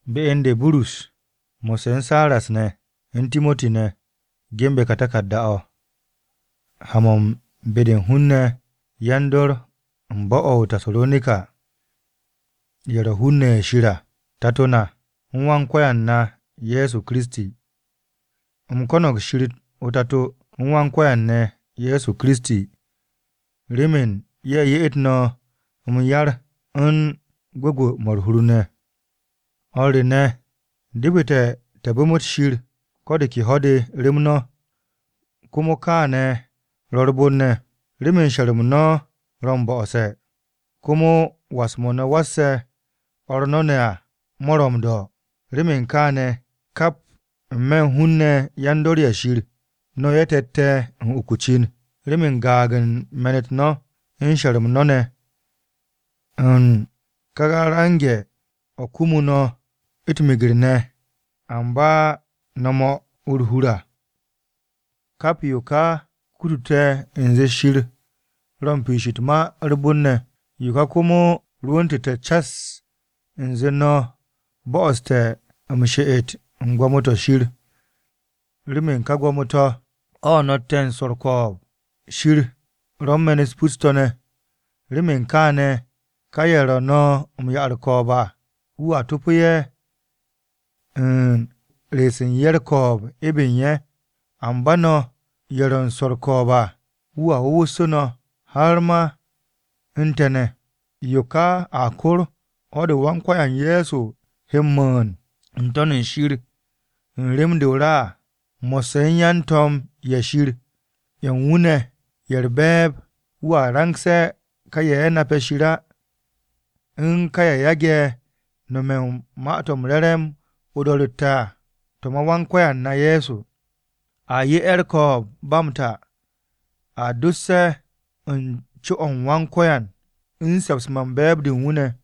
Be u̱n de Burus, mo̱sse̱ u̱n Siras ne̱, u̱n Timoti ne̱, ge̱nbe̱ ka taku̱rda-o̱, ha-mo̱ u̱n be-de u̱n hun-ne̱ yan-dor u̱n bo̱-o̱ o-Tasaronika ye̱ ro̱ hun-ne̱ ye̱ Shir à Tato na u̱n Wan-Ko̱yan ne̱ Ye̱so Kiristi. U̱m ko̱no̱g Shir o-Tato u̱n Wan-Ko̱yan ne̱ Ye̱so Kiristi remen ye̱ ye'et no̱ m-yar u̱n gwu̱gwu̱-mo̱ u̱r-hur ne̱. O̱r te̱ ne̱, depete̱ te̱ bu̱m Shir ko̱ de ke ho̱-de rem no̱, komo kaane̱ ro̱ u̱r-bon ne̱, remen she̱r-m no̱ ro̱ m-bo̱'o̱se̱, komo was-mo̱ no̱ wasse̱ o̱r no̱ ne̱ à mo̱ ro̱ m-do̱. Remen kaane̱, kap u̱n n-me̱ u̱n hun-ne̱ yan-dor-ye̱ Shir, no̱ ye̱ te̱tte̱ u̱n uk o-cin remen gaag u̱n me̱n-u̱t no̱ u̱n she̱r-m no̱ ne̱ u̱n ka range̱-o̱ kumu no̱ u̱t-meger ne̱ amba no̱ 'mo u̱r-hur à. Kap yo ka kutute̱ u̱nze Shir ro̱ u̱n piish u̱t-ma u̱r-bon ne̱, yo ka komo rwu̱ntu̱te̱ cas u̱nze no̱ bo̱'o̱ste̱ m-she'et u̱n gwo̱mo-to̱ Shir remen ka gwo̱mo-to̱, o̱ no̱tte̱ u̱n swo̱ u̱r-ko̱o̱b. Shir ro̱ u̱n me̱n-u̱t pus-to̱ ne̱, remen kaane̱, ka ye̱ ro̱ no̱ m-'ya u̱r-ko̱o̱b à wu̱a to̱pe̱ ye̱ u̱n re̱e̱su̱ u̱n ye̱ u̱r-ko̱o̱b ebe u̱n ye̱. Amba no̱ ye̱ ro̱ u̱n swo̱ u̱r-ko̱o̱b à wu̱a wu̱wu̱ssu̱ no̱, har ma u̱n te̱ ne̱. Yo ka a kor u̱n ho̱-de Wan-Ko̱yan Ye̱so he m-rwu̱u̱n n-To̱n shir u̱n rem-de o-ra à, mo̱sse̱ u̱n yan-to̱m-ye̱ Shir ye̱ u̱n wu̱ ne̱ ye̱ u̱r-be̱e̱b. Wu̱a rangse̱ ka ye̱ nape̱ Shir á u̱n ka ye̱ yage̱ nome̱ u̱n Ma-to̱ m-Re̱re̱m o-do̱ro̱tte̱ à to̱ ma Wan-Ko̱yan na Ye̱so. A 'ye ye̱ ko̱o̱b-de ba m-ta, a dos ye̱ u̱n co-o Wan-Ko̱yan u̱n se̱ps-mo̱ u̱n be̱e̱b-de u̱n wu̱ ne̱.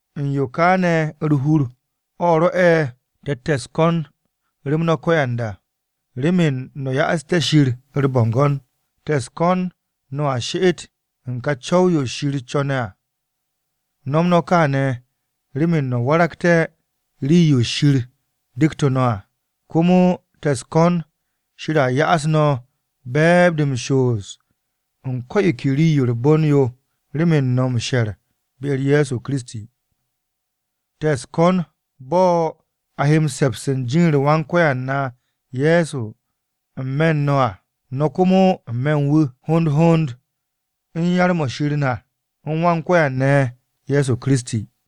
U̱n yo ka ne̱ u̱r-hur, o̱ rwo̱'e̱ te̱tte̱ u̱s-ko̱n rem no̱ ko̱yanda, remen no̱ ya'asté̱ Shir u̱r-bo̱ngo̱n. Te̱ u̱s-ko̱n no̱a she'et u̱n ka co̱w-yo Shir co̱ne̱ à. No̱m no̱ kaane̱ remen no̱ waragté̱ rii-yo Shir dektu̱ no̱ à. Komo te̱ u̱s-ko̱n Shir a ya'as no̱ be̱e̱b-de m-shoos u̱n ko̱ yo ke rii-yo u̱r-bon yo remen no̱ m-she̱r be-u̱r Ye̱so Kiristi. Te̱ u̱s-ko̱n u̱n bo̱ a he se̱ps u̱n jin-u̱r Wan-Ko̱yan na Ye̱so n-me̱ u̱n no̱ à, no̱ komo n-me̱ u̱n wu̱, hond hond u̱n yar-mo̱ Shir na, u̱n Wan-Ko̱yan ne̱ Ye̱so Kiristi.